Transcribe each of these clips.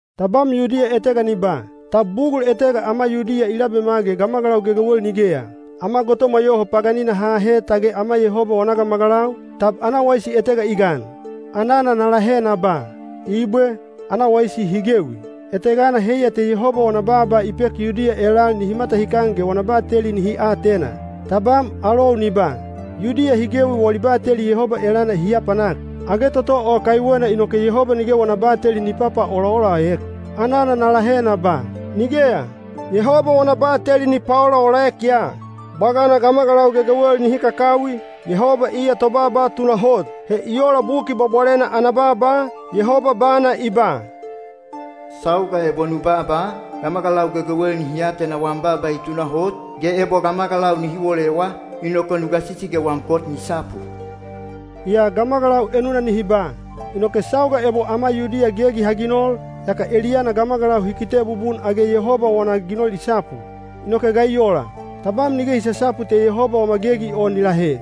Tabam Yudiya etega ni ba, “Tab bugul etega ama Yudiya i labema ge gamagalau gegewel nigeya? Ama gotomwa yoho paganina ha ahe tage ama Yehoba wana gamagalau, tab ana waisi etega i gan?” Anana na lahe na ba, “Ibwe, ana waisi hi gewi. Etegana heiya te Yehoba wana baaba i pek Yudiya elal nihi matahikan ge wana bateli nihi atena.” Tabam alou ni ba, “Yudiya hi gewi wali bateli Yehoba elana hi apanak. Age toto o kaiwena inoke Yehoba nige wana bateli ni papaolaolaek?” Anana na lahe na ba, “Nigeya! Yehoba wana bateli ni paolaolaek ya. Bwagana gamagalau gegewel nihi kakawi, Yehoba iya tobaaba tunahot. He i ola Buki Bwabwalena ana baaba, Yehoba bana i ba: Sauga ebo nu baaba, gamagalau gegewel nihi atena wam baaba i tunahot, ge ebo gamagalau nihi wolewa, inoke nu gasisi ge wam kot ni sapu.” Yaa gamagalau enuna nihi ba, “Inoke sauga ebo ama Yudiya gegi ha ginol, yaka eliyana gamagalau hi kite bubun age Yehoba wana ginol i sapu. Inoke ga i ola? Tabam nige i sasapu te Yehoba wama gegi o ni lahe.”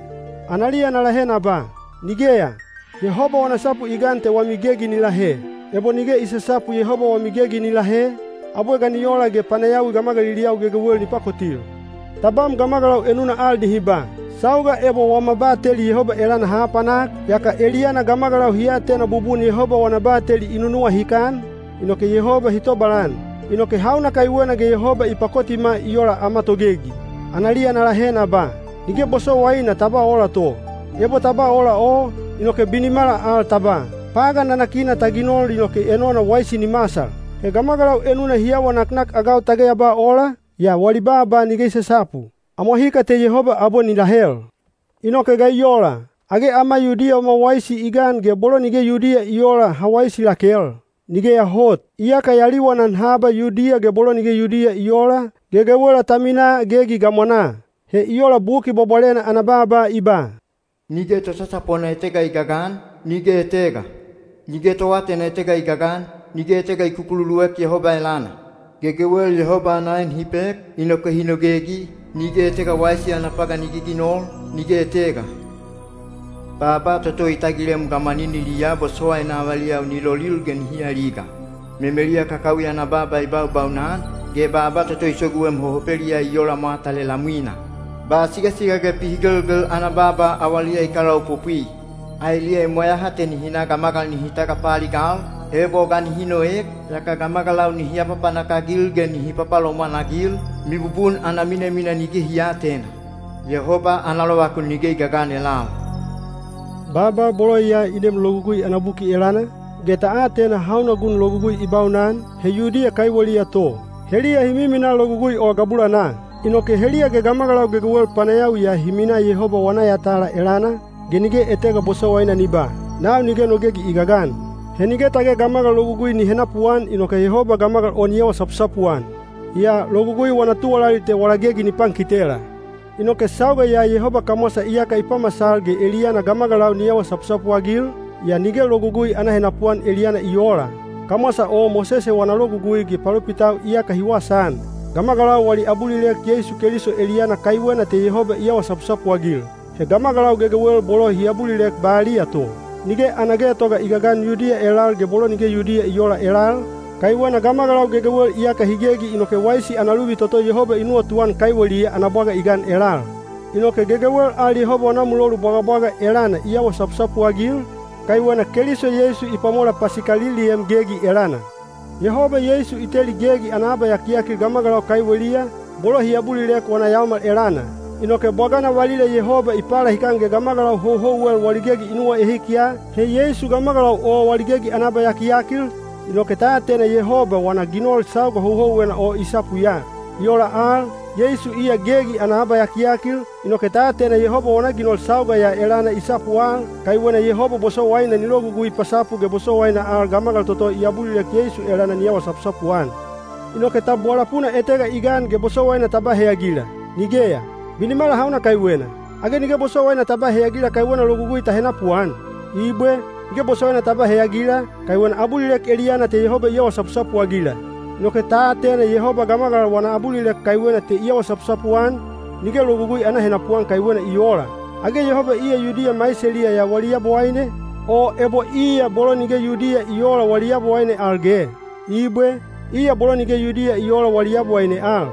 Analiya na lahe na ba, “Nigeya! Yehoba wana sapu i gan te wami gegi ni lahe. Ebo nige i sasapu Yehoba wami gegi ni lahe, abwe ga ni ola ge panayawi gamagaliliyau gegewel ni pakotil?” Tabam gamagalau enuna al nihi ba, “Sauga ebo wama bateli Yehoba elana ha apanak, yaka eliyana gamagalau hi atena bubun Yehoba wana bateli i nunuwahikan, inoke Yehoba hi tobalan. Inoke hauna kaiwena ge Yehoba i pakotima i ola ama togegi?” Analiya na lahe na ba, “Nige bosowaina ta ba ola to. Ebo ta ba ola o, inoke binimala al ta ba, ‘Pagan nanakina ta ginol inoke enona waisi ni masal!’” He gamagalau enuna hi awa naknakagau tage ya ba ola, yaa wali baaba nige i sasapu. Amwahika te Yehoba abwe ni lahel. Inoke ga i ola? Age ama Yudiya wama waisi i gan ge bolo nige Yudiya i oola ha waisi lakel? Nigeya hot! Iyaka ya liwanan haba Yudiya ge bolo nige Yudiya i oola, gegewela ta minaa gegi gamwanaa. He i ola Buki Bwabwalena ana baaba i ba: Nige tosasapona etega i gagan, nige etega. Nige toatena etega i gagan, nige etega i kukululuek Yehoba elana. Gegewel Yabowaine ana en hi pek, inoke hi nogegi, nige etega wana ginol i wawaisi, nige etega. Baaba toto i tagilem gamwaniniliyaa bosowaina avaliyau ni lolil ge nihi aliga. Memeliya kakawi ana baaba i baubaunan, ge baaba toto i soguem hohopeliyaa i ola mwata lelamwina. Ba nuwamut ge pihigelgel ana baaba awaliya i kalaopopwi. Aeliya i mweyaha te nihi na gamagal nihi tagapaaligal, ebo ga nihi noek, yaka gamagalau nihi apapanak-agil ge nihi papalomwan-agil, mibubun ana minamina nige hi aatena. Yehoba ana lovakun nige i gagan elal. Baaba bolo ya i neem Logugui ana buki elana, ge ta atena hauna gun Logugui i baunan, he Yudiya kaiweliya to, heliya hi miminaa Logugui o gabulanaa. Inoke heliya ge gamagalau gegewel panayawiya hi minaa Yehoba wana yatala elana, ge nige etega bosowaina ni ba, “Nau nige no gegi i gagan.” He nige tage gamagal logugui ni henapuan inoke Yehoba gamagal o ni awa sapusapu-an. Yaa logugui wana tuwalali te wala gegi ni pankitela. Inoke sauga ya Yehoba kamwasa iyaka i pamasal ge eliyana gamagalau ni awa sapusapu-agil, yaa nige logugui ana henapuan eliyana i oola. Kamwasa o Mosese wana Logugui ge palopitau iyaka hi wasaan. Gamagalau wali abulilek Yeisu Keliso eliyana kaiwena te Yehoba i awa sapusapu-agil. He gamagalau gegewel bolo hi abulilek baliya to. Nige ana getoga i gagan Yudiya elal ge bolo nige Yudiya i oola elal, kaiwena gamagalau gegewel iyaka hi gegi inoke waisi ana luvi toto Yehoba i nuwatuan kaiweliya ana bwaga i gan elal. Inoke gegewel al Yehoba wana mulolu bwagabwaga elana i awa sapusapu-agil, kaiwena Keliso Yeisu i pwamola pasikaliliem gegi elana. Yehoba Yeisu i teli gegi ana abayakiyakil gamagalau kaiweliya, bolo hi abulilek wana yaomal elana. Inoke bwagana valila Yehoba i palahikan ge gamagalau houhouwel wali gegi i nuwaehik ya, he Yeisu gamagalau o wali gegi ana abayakiyakil, inoke ta atena Yehoba wana ginol sauga houhouwena o i sapu ya. I ola al, Yeisu iya gegi ana abayakiyakil, inoke ta atena Yehoba wana ginol sauga ya elana i sapu al, kaiwena Yehoba bosowaina ni logugui pasapu ge bosowaina al gamagal toto i abulilek Yeisu elana ni awa sapusapu-an. Inoke tab wala puna etega i gan ge bosowaina ta ba heyagila? Nigeya! Binimala hauna kaiwena? Age nige bosowaina ta ba heyagila kaiwena logugui ta henapuan? Ibwe, nige bosowaina ta ba heyagila, kaiwena abulilek eliyana te Yehoba i awa sapusapu-agila. Inoke ta atena Yehoba gamagal wana abulilek kaiwena te i awa sapusapu-an, nige logugui ana henapuan kaiwena i oola. Age Yehoba iya Yudiya maiseliya ya wali Yabowaine, o ebo iya bolo nige Yudiya i oola wali Yabowaine al ge? Ibwe, iya bolo nige Yudiya i oola wali Yabowaine al.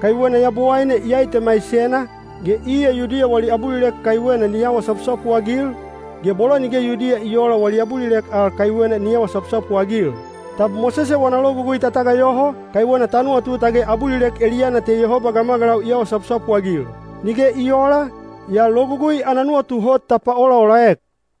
Kaiwena Yabowaine iyai te maisena, ge iya Yudiya wali abulilek kaiwena ni awa sapusapu-agil, ge bolo nige Yudiya i oola wali abulilek al kaiwena ni awa sapusapu-agil. Tab Mosese wana Logugui ta tagayoho, kaiwena ta nuwatu tage abulilek eliyana te Yehoba gamagalau i awa sapusapu-agil? Nige i oola, yaa Logugui ana nuwatu hot ta paolaolaek.